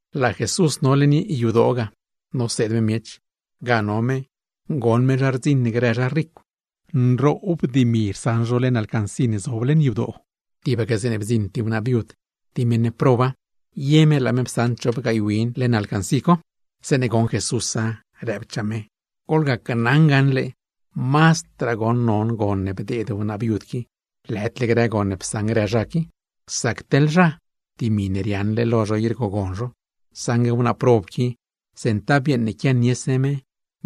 Laa Jesús no leṉ yadoo ga noseed me miech. Ga no me, goṉ me zha rdziṉ grë zha ricw, nroob dimi rsaṉ zho leṉ alcancí ne zob ga. Tibaque zeeṉe bdziṉ tib wnaa viud, tib meṉ proba, ye me laa me psaṉ chop gaay win leṉ alcancí co. Zeeṉe goṉ Jesúsa, rëbchaa me: ―Gneli naa lo to gaṉle, mazdraa goṉ non gon ne bdeed wnaa viud qui, lëdle grë gon ne psaṉ grë zha qui. Sac teḻ zha, dimi ne riaaṉle lo zho i rgogon zho; saṉgue wnaa prob qui goṉ, centav yeeṉ ne quianiese me,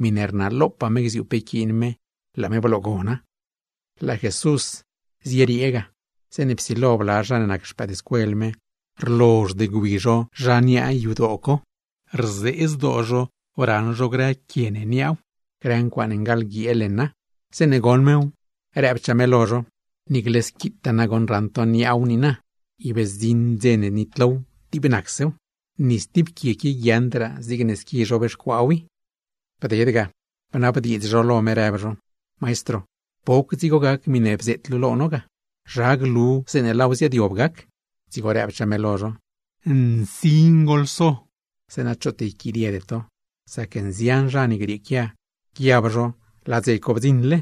miṉe rnalopaa me gziuu pe yquiin me, per laa me bloogona. Laa Jesús zieriee ga, zeeṉe psilo bla zha ne nac xpëëdscuel me, rlozhd gwi zho zha niaa yadoo co, rzee zdoo zho raṉ zho grë quie ne niaaw, grë ncuaaṉe ngaḻguiee leṉa. Zeeṉe goṉ mew, rëbchaa me lo zho: ―Niicle squitaa goṉ raṉ to niaaw niina, per zdziṉ dze ne nitlow, dib nacsew. Ni stib quie qui guiaaṉdraa zigne squi zhobxcuaaw i. Bded ga, bnabdiidz zho lo me, rëb zho: ―Maestro, ¿poc dzigo gac miṉe bzeet luu ga? ¿Zha glu zeeṉe laaw ziaadyob gac? Dzigo rëbchaa me lo zho: ―Nsin goḻso, zeeṉa choot yquidiede to. Sac nzian zha ne grieequia, guiab zho laa dze co bdziṉle,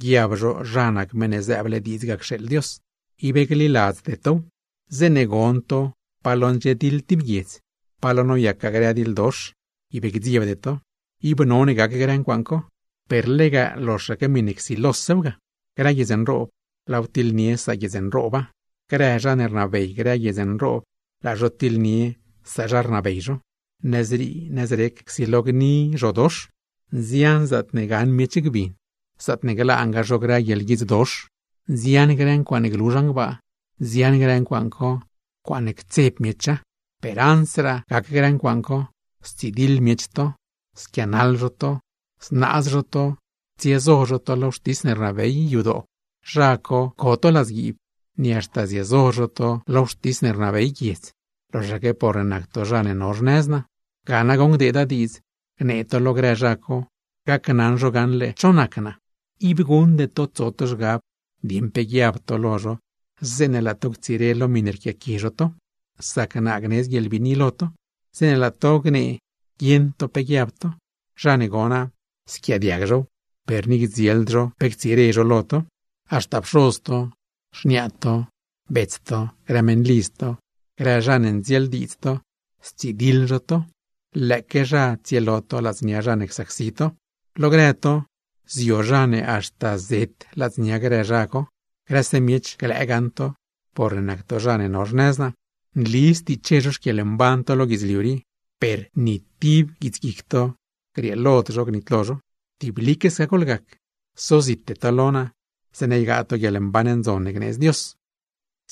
guiab zho zha nac Meṉ ne zëëble diidz ga cxeeḻ Dios. ¡Ib gliladzde tow! Zeeṉe gon to pa lo ndxiediḻ tib guiedz, pa lo noyacgaa grë diḻdox, ib gdziebde to. Ib none gac grë ncuaaṉ co, per lega loxaque miṉe csilosew ga. ’Grë guiedz nroob, laaw tiḻnie saguiedz nrooba; grë zha ne rnabey grë guiedz nroob, laa zho tiḻnie sazha rnabey zho. Nëzrii nëzrec csilo gni grë zhodox, nzian zaatne gaṉ miech gbin, zaatne glaangaa zho grë guieḻguidzdox. Nzian grë ncuaaṉe glu zhan gbaa, nzian grë ncuaaṉ co, ncuaaṉe ctseb miecha. Per ansraa gac grë ncuaaṉ co, stsidiḻ miech to, squianaḻ zho to; znaaz zho to, tsiezo zho to lo wxtis ne rnabey yadoo, zha co co to ladzguiib, ni haxta ziezo zho to lo wxtis ne rnabey guiedz, loxaque porne nac to zha ne no xnëz naa. Ga nagoṉ gdeeda diidz gnee to lo grë zha co, gacnaṉ zho gaṉle cho nac naa. Ib guṉde to tso to zhgab dieṉ pe guiab to lo zho, zeeṉe laa to ctsire lo miṉe rquiaqui zho to; sac naa gnedz guieḻbiini lo to, zeeṉe laa to gnee guieṉ to pe guiab to. Zha ne gona, squiaadiag zhow, per ni gdzield zho pe ctsire zho lo to. ’Haxta pxoz to, xniaa to, bets to, grë meṉlidz to, grë zha ne ndzieeldiidz to, stsidiḻ zho to, lëëque zha tsielo to ladznia zha ne csacsi to. Lo grë to, zio zha ne haxta zet ladznia grë zha co. Grëse miech glëë gaṉ to porne nac to zha ne no xnëz naa. Nli stiche zho xquieḻmban to lo guidzliu rii, per, ¡ni tib guits guic to, grieelod zho gnitlo zho! Tiblique sca goḻgac, sozite to lo naa, zeeṉa ygaa to guieḻmban ndzon ne gneedz Dios.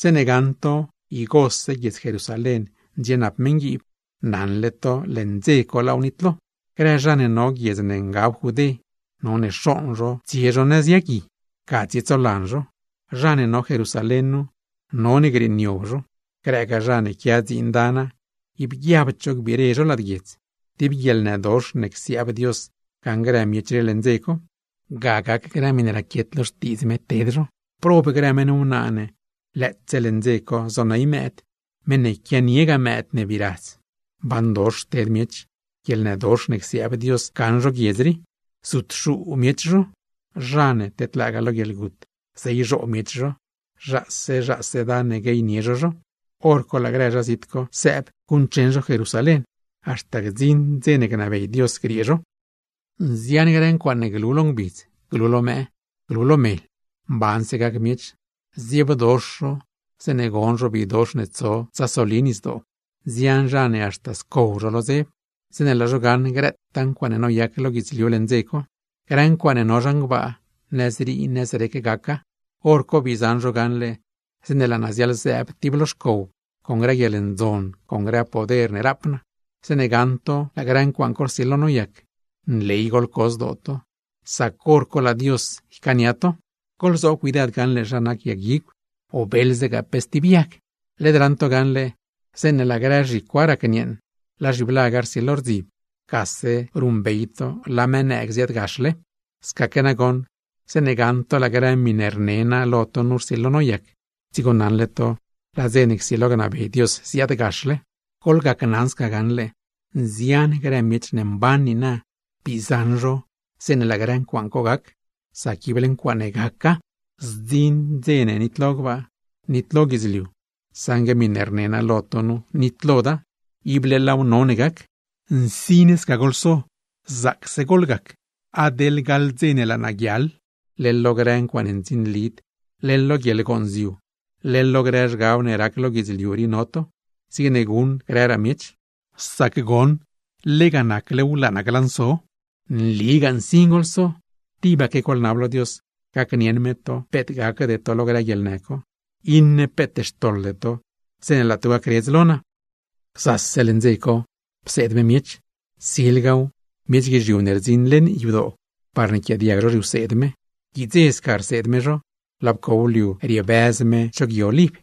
’Zeeṉe gaṉ to igose guiedz Jerusalén ndxienap meṉguiib, naṉle to leṉ dze co laaw nitlo. Grë zha ne no guiedz ne ngab Judé, none xooṉ zho tsie zho nëz yagui, ga tsietsolan zho. Zha ne no Jerusalén nu, none grieeniob zho. Grëgaa zha ne quia dziin dana, ib guiabd zho gbire zho lad guiedz. Tib guieḻnëdox ne csiaab Dios gaṉ grë miech rii leṉ dze co, ga gac grë miṉe raquiet lo Xtiidz me ted zho. ¡Prob grë meṉ wnaa ne lëëtse leṉ dze co zoney xpëëd, meṉ ne quianiegaa mëëd ne bii radz! ¡Mbandox ted miech, guieḻnëdox ne csiaab Dios gaṉ zho guiedz rii! Zutxuu miech zho, zha ne tedlaagaa lo guieḻgut zeyzhoo miech zho, zhaase zhaase dan ne gueynie zho zho. Horco laa grë zha zit co, sëëb guṉcheṉ Jerusalén; haxta gdziṉ dze ne gnabey Dios griee zho. ’Nzian grë ncuaaṉe glu lo ngbidz, glu lo mëë, glu lo mel. Mbanse gac miech, zdziebdox zho zeeṉe gon zho bidox ne tso tsasoli nisdoo. Nzian zha ne haxta scow zho lo dzeb, zeeṉe laa zho gaṉ grëtaa ncuaaṉe noyac lo guidzliu leṉ dze co. Grë ncuaaṉe no zhan gbaa, nëzrii nëzrec gaca. Horco bii zaṉ zho gaṉle zeeṉe laa naa ziaḻzëëb tib lo xcow con grë guieḻndzon, con grë poder ne rap naa. Zeeṉe gaṉ to laa grë ncuaaṉ co rsilo noyac, nley goḻco zdoo to; ¡sac hor co laa Dios ycaania to! ’Goḻzoob cuidad gaṉle zha nac yag guigw, beeḻzegaa pe stib yag. Led raṉ to gaṉle, zeeṉe laa grë zhicwa racnieeṉ, laa zhiblaga rsilo rdzib, gase ruṉbey to laa mëë nëëg ziaadgaxle. Scaque nagoṉ zeeṉe gaṉ to laa grë miṉe rne naa lo to nu rsilo noyac, dzigo naṉle to laa dze ne csilo gnabey Dios ziaadgaxle. Gneli naa lo to gaṉle, nzian grë miech ne mban niina, bii zaṉ zho zeeṉe laa grë ncuaaṉ co gac; sac ible ncuaaṉe gaca. Zdziṉ dze ne nitlo gbaa, nitlo guidzliu, saṉgue miṉe rne naa lo to nu nitloda; ible laaw none gac. ¡Nsin sca goḻso, zaacse goḻgac! ¡Adeḻ gaḻ dze ne laa naa guiaḻ, leḻ lo grë ncuaaṉe ndzinlid, leḻ lo guieḻgonziu, leḻ lo grë zhgab ne rac lo guidzliu rii no to, zigne guṉ grëraa miech! Sac goṉ, lega naclew glanso naa. Nligaa nsin goḻso. Tibaque goḻnab lo Dios, gacnieṉ me to peet gacde to lo grë guieḻnë co, iṉe peet xtoḻde to zeeṉe laa to gacredz lo naa. Gzase leṉ dze co pseed me miech. Silgaw, miech guizhiu ne rdziṉ leṉ yadoo, parne yquiaadiag zho zhiwseed me. Guidze sca rseed me zho, laa pcow liu riebëz me cho Gui Oliv.